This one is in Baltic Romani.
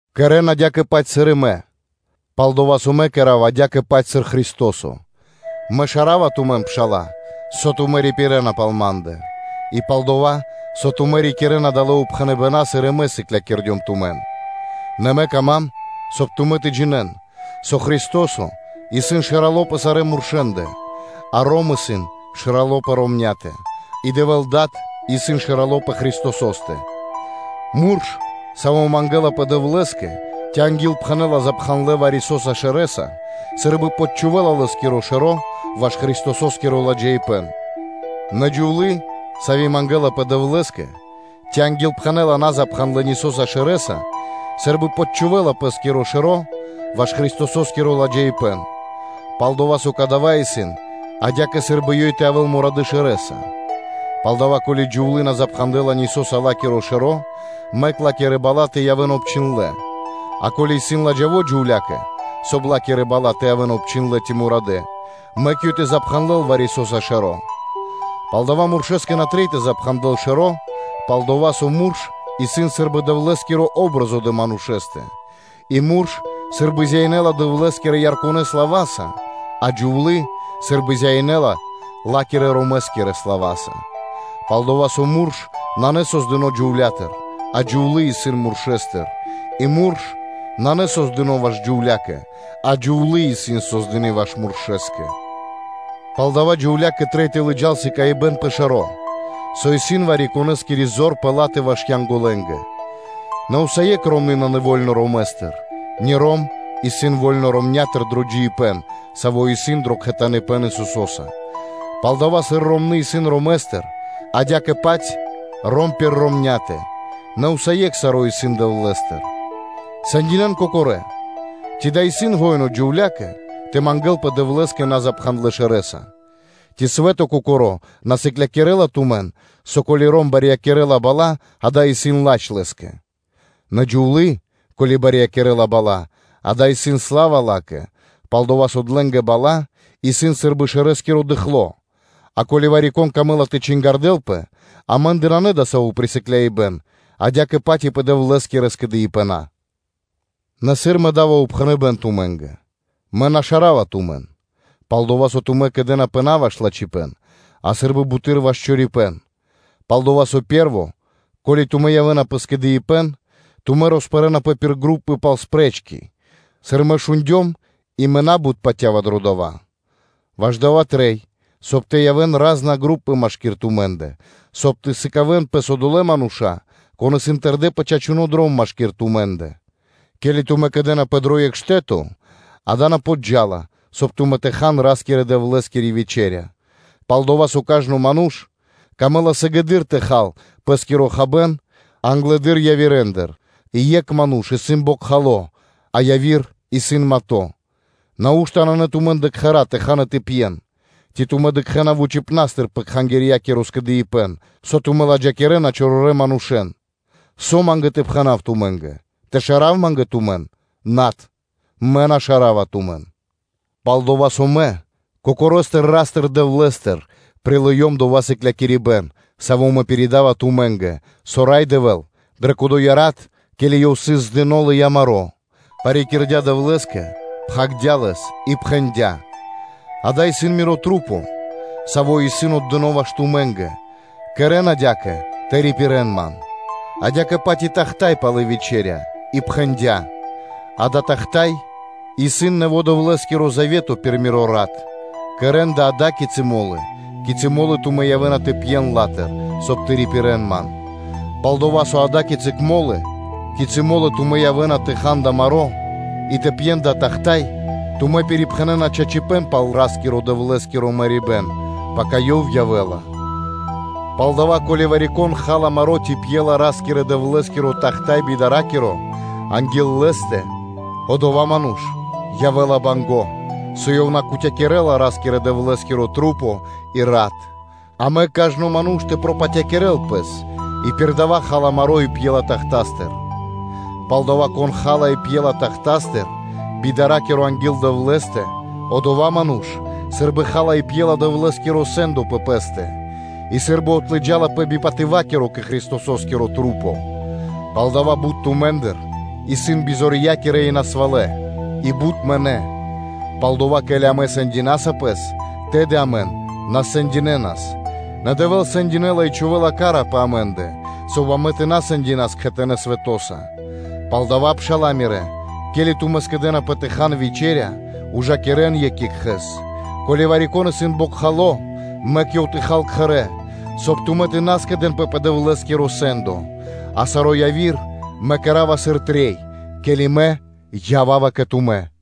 Кэрэ́н адя́кэ-паць, сыр и мэ, пал-дова́ со мэ кэра́ва адя́кэ-паць, сыр Христо́со. Мэ шарава тумэн, пшала́лэ, со тумэ́ рипирэна пал ма́ндэ; и пал дова́, со тумэ́ рикирэ́на далэ́ упхэныбэна́, сыр мэ и сыклякирдём тумэн. Нэ мэ кама́м, соб (кай) тумэ́ тэ джинэ́н, со Христо́со исын Шэрало́ пэ сарэ́ муршэндэ, а ром исын шэрало́ пэ ромня́тэ, и Дэвэ́л Дад исын Шэрало́ пэ Христосо́стэ. Мурш, саво́ мангэлапэ Дэвлэ́скэ, ци ангилпхэнэла запхандлэ вари-со́са шэрэ́са, сы́рбы подчхувэла лэ́скиро шэро́ ваш Христосо́скиро ладжаипэ́н. Нэ джувлы́, сави́ мангэлапэ Дэвлэ́скэ, ци ангилпхэнэла назапхандлэ нисоса шэрэ́са сы́рбы подчхувэла пэ́скиро шэро́ ваш Христосо́скиро ладжаипэ́н; пал-дова́ со кадава́ исын адя́кэ, сы́рбы ёй тэ явэ́л мурадэ́ шэрэ́са. Палдава́, ко́ли джувлы́ на запхандэла нисоса пэ́скиро шэро́, мэк ла́кирэ бала́ тэ явэ́н обчхиндлэ́. А ко́ли исын ладжаво джувля́кэ, соб (кай) ла́кирэ бала́ тэ явэ́н обчхиндлэ́ ци тэ явэ́н мурадэ́, мэк ёй тэ запхандэл вари-со́са шэро́. Палдава́ муршэскэ на трэй тэ запхандэл шэро́, пал-дова́ со мурш исын сы́рбы Дэвлэ́скири патри́н (о́бразо) дрэ манушэ́стэ, и мурш сы́рбы зяинэла Дэвлэ́скирэ ярконэ слава́са, а джувлы́ сы́рбы зяинэла ла́кирэ-ромэскирэ слава́са. Пал-дова́ со мурш нанэ создыно́ джувлятыр, а джувлы́ исын муршэстыр. И мурш нанэ создыно́ ваш джувля́кэ, а джувлы́ исын создыны́ ваш муршэ́скэ. Палдава́ джувля́кэ трэй тэ лыджа́л шпэ́ра (знако) пэ шэро́, со ёй исын вари-конэ́скири ваш Янголэнгэ. Нэ усае́кх ромны́ нанэ во́льно ромэстыр, ни ром исын во́льно ромнятыр дро джиибэ́н, саво́ исын дро кхэтаныпэн Исусо́са. Палдава́, сыр ромны́ исын ромэстыр, адя́кэ-паць ром пир ромня́тэ, нэ усае́кх саро́ исын Дэвлэ́стыр. Сэндинэн кокорэ́: ци дава́ исын шука́р джувля́кэ тэ мангэ́лпэ Дэвлэ́скэ назапхандлэ́ шэрэ́са? Ци свэ́то кокоро́ на сыклякирэ́ла тумэн со, ко́ли ром барьякирэ́ла бала́, дава́ исын ладж лэ́скэ? Нэ джувлы́, ко́ли барьякирэ́ла бала́, дава́ исын сла́ва ла́кэ; пал-дова́ со длэнгэ бала́ исын сы́рбы дыкхло. А ко́ли вари-кон камэ́ла тэ чингардэлпэ, амэ́ндэ нанэ дасаво присыкляибэн, адя́кэ-паць и пэ Дэвлэ́скирэ скэдыибэна. Нэ, сыр мэ да́ва упхэныбэ́н тумэ́нгэ, мэ на шарава тумэн; пал-дова́ со тумэ́ кэдэнапэ на ваш лачхипэ́н, а сы́рбы буты́р ваш чорипэ́н. Палдава́, дро пэ́рво, ке́ли тумэ́ явэ́на пэ скэдыибэ́н, тумэ́ роспэрэнапэ пир групы тэ чингардэспэ, сыр мэ шундём, и мэ на́бут патя́ва дро дава́. Ваш дава́ трэй, соб (кай) тэ явэ́н ра́зна групы машки́р тумэ́ндэ, соб (кай) тэ сыкавэ́н пэс одолэ́ мануша́, кон исын тэрдэ́ пэ чачуно́ дром машки́р тумэ́ндэ. Ке́ли тумэ́ кэдэнапэ дро екх штэ́то, дава́ на подджа́ла, соб (кай) тумэ́ тэ хан Ра́скирэ-Дэвлэ́скири вечэ́ря. Палдова́ – со кажно ману́ш камэ́ла сыгэды́р тэ хал пэ́скиро хабэ́н англэды́р явирэндыр и екх ману́ш исын бокхало, а яви́р исын мато. Нау́што нанэ тумэ́ндэ кхэра́ тэ хан и тэ пьен? Ци тумэ́ дыкхэ́на вучипна́стыр пэ Кхангирья́киро скэдыибэ́н, со тумэ́ ладжакирэна чорорэ́ манушэ́н. Со ма́нгэ тэ пхэна́в тумэ́нгэ? Тэ шара́в ма́нгэ тумэн? Над, мэ на шарава тумэн. Пал-дова́ со мэ Кокорэстыр Ра́стыр-Дэвлэ́стыр прилыём дова́ сыклякирибэ́н, саво́ мэ пиридава тумэ́нгэ, со Рай Дэвэ́л дрэ кодоя рат, ке́ли Ёв сыс здыно, лыя́ маро́, парикирдя Дэвлэ́скэ, пхагирдя́ лэс и пхэндя́: “Дава́ исын Мирэ́ Маса́, савэ́ исын отдынэ́ ваш тумэ́нгэ: кэрэ́н адя́кэ тэ рипирэ́н Ман.” Адя́кэ-паць и тахта́й пало́ вечэря и пхэндя́: “Дава́ тахта́й исын нэво́ Дэвлэ́скиро завето пир миро рат: кэрэ́н дава́ ада́кицы мо́лы, кицы́ мо́лы тумэ́ явэ́на тэ пьен лэ́стыр (ла́тыр), соб (кай) тэ рипирэ́н Ман.” Пал-дова́ со ада́кицы мо́лы, кицы́ мо́лы тумэ́ явэ́на тэ хан дава́ маро́ и тэ пьен дава́ тахта́й, тумэ́ пирипхэнэна чачипэ́н пал Ра́скирэ-Дэвлэ́скиро мэрибэ́н, пака Ёв явэ́ла. Палдава́, ко́ли вари-кон ха́ла маро́ ци пьела Ра́скирэ-Дэвлэ́скиро тахта́й би патыва́киро (би дара́киро) анги́л Лэ́стэ, одова́ ману́ш явэ́ла банго́, со ёв на кутякирэла Ра́скирэ-Дэвлэ́скирэ маса́ и рат. А мэк кажно ману́ш тэ пропатякирэл пэс и пир дава́ ха́ла маро́ и пьела тахтастыр. Палдава́, кон ха́ла и пьела тахтастыр би дара́киро анги́л Дэвлэ́стэ, одова́ ману́ш сы́рбы ха́ла и пьела Дэвлэ́скиро сэ́ндо пэ пэ́стэ, и сы́рбы отлыджалапэ би патыва́киро кэ Христосо́скирэ Маса́. Палдава́ бут тумэ́ндыр исын бизорья́кирэ и насвалэ, и бут мынэ́. Палдава́, ко́ли амэ сэндинасас пэс, тэды амэн на сэндинэнас. Нэ Дэвэ́л сэндякирэ́ла и чхувэ́ла хась (ка́ра) пэ амэ́ндэ, соб (кай) амэн тэ на сэндинэ́н кхэтанэ́ свэтоса. Палдава́, пшала́лэ мирэ́, ке́ли тумэ́ скэдэ́напэ тэ хан вечэря, ужакирэн екх екхэ́с. Ко́ли вари-кон исын бокхало, мэк ёв тэ хал кхэрэ́, соб (кай) тумэ́ тэ на скэдэ́нпэ пэ Дэвлэ́скиро сэ́ндо. А саро́ яви́р мэ кэра́ва, сыр трэй, ке́ли мэ ява́ва кэ тумэ́.